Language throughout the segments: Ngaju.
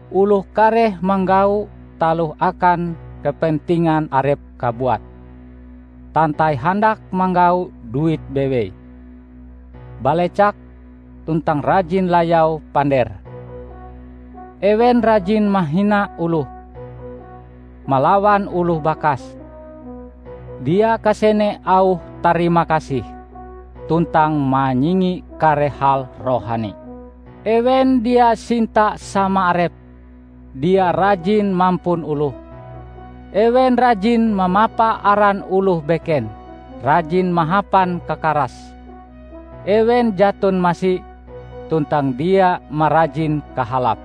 Oloh kareh manggau taloh akan kepentingan arepe kabuat, tantai handak manggau duit bewei, balecak tuntang rajin layau pandere. Ewen rajin mahina oloh, malawan oloh bakas, dia kasene auh tarimakasih, tuntang manyingi kare hal rohani. Ewen dia sinta sama arepe, dia rajin mampun oloh, ewen rajin mamapa aran oloh beken, rajin mahapan kakaras, ewen jaton masi, tuntang dia marajin kahalap.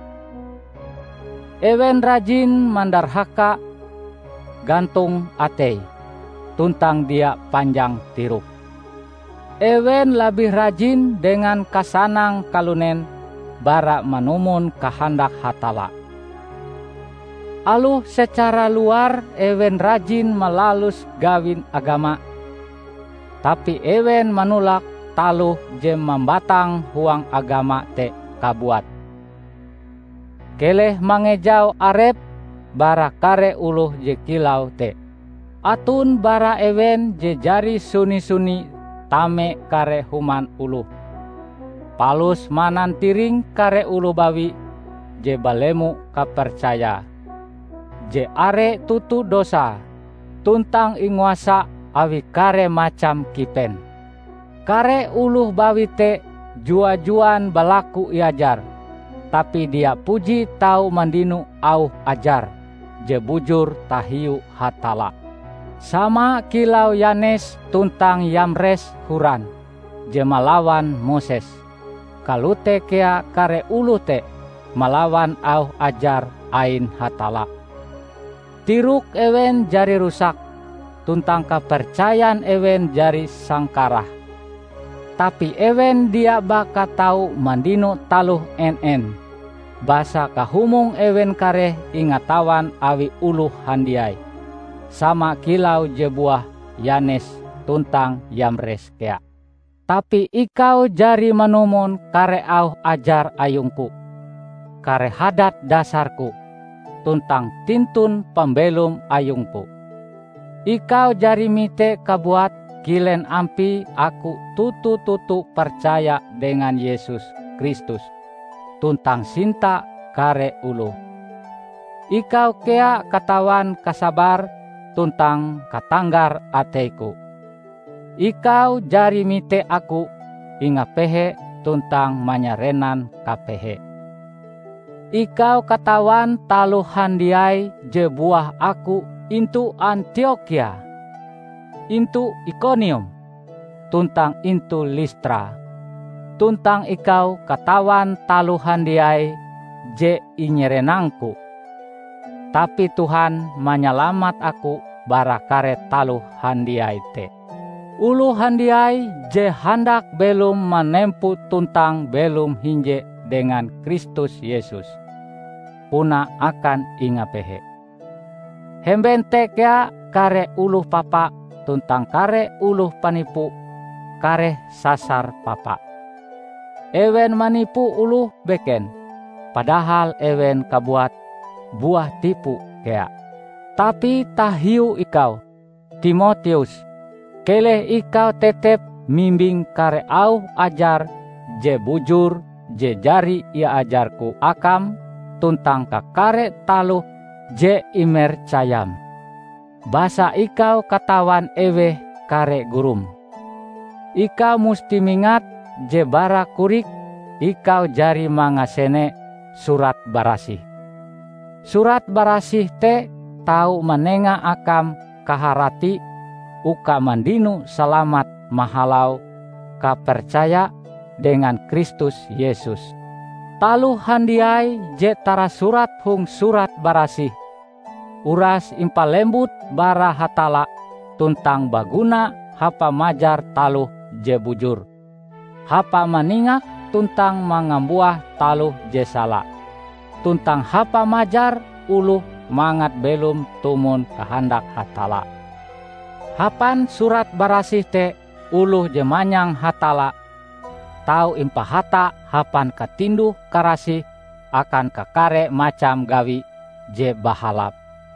Ewen rajin mandarhaka, gantong ateie tuntang dia panjang tiroke. Ewen labih rajin dengan kasanang kalunen bara manumon kahandak Hatalla. Aloh secara luar ewen rajin malalus gawin agama, tapi ewen manolak taloh je mambatang huang agama te kabuat. Keleh mangejau arepm bara kare oloh je kilau te. Aton bara ewen je jari suni-suni tame kare human oloh, palus manantiring kare oloh bawi je balemo kapercayae, je are toto dosae tuntang inguasa awi kare macam kipen. Kare oloh bawi te jua-juan balaku iajar, tapi dia puji tau mandino auh ajar je bujur tahiu Hatalla. Sama kilau Yanes tuntang Yamres horan je malawan Moses, kalote kea kare oloh te malawan auh ajar ain Hatalla. Tirok ewen jari rusak, tuntang kapercayan ewen jari sangkarah. Tapi ewen dia baka tau mandino taloh en-en, basa kahumong ewen kareh ingatawan awi oloh handiai, sama kilau je buah Yanes tuntang Yamres kea. Tapi ikau jari manumon kare auh ajar ayungku, kare hadat dasarku, tuntang tintun pambelom ayungku. Ikau jari mite kabuat kilen ampie aku toto-toto percaya dengan Yesus Kristus tuntang sinta kare oloh. Ikau kea katawan kasabar tuntang katanggar ateiku. Ikau jari mite aku ingapehe tuntang manyarenan kapehe. Ikau katawan taloh handiai je buah aku intu Antiokhia, intu Ikonium, tuntang intu Listra; tuntang ikau katawan taloh handiai je inyarenangku. Tapi Tuhan manyalamat aku bara kare taloh handiai te. Oloh handiai je handak belom manempo tuntang belom hinje dengan Kristus Yesus, puna akan ingapehe, Hemben te kea kare oloh papa tuntang kare oloh panipu kareh sasar papa. Ewen manipu oloh beken padahal ewen kabuat buah tipu kea. Tapi tahiu ikau, Timoteus, keleh ikau tetep mimbing kare auh ajar je bujur je jari iajarku akam tuntang kakare taloh je imercayam; basa ikau katawan eweh kare gurum. Ikau musti mingat je bara korik ikau jari mangasene Surat Barasih. Surat Barasih te tau manenga akam kaharati uka mandino salamat mahalau kapercaya dengan Kristus Yesus. Taloh handiai je tarasurat hong Surat Barasih, uras impalembut bara Hatalla tuntang baguna hapa majar taloh je bujur, hapa maningak tuntang mangambuah taloh je sala, tuntang hapa majar oloh mangat belom tumon kahandak Hatalla. Hapan Surat Barasih te oloh je manyang Hatalla tau impahata hapan katinduh-karasih akan kakare macam gawi je bahalap.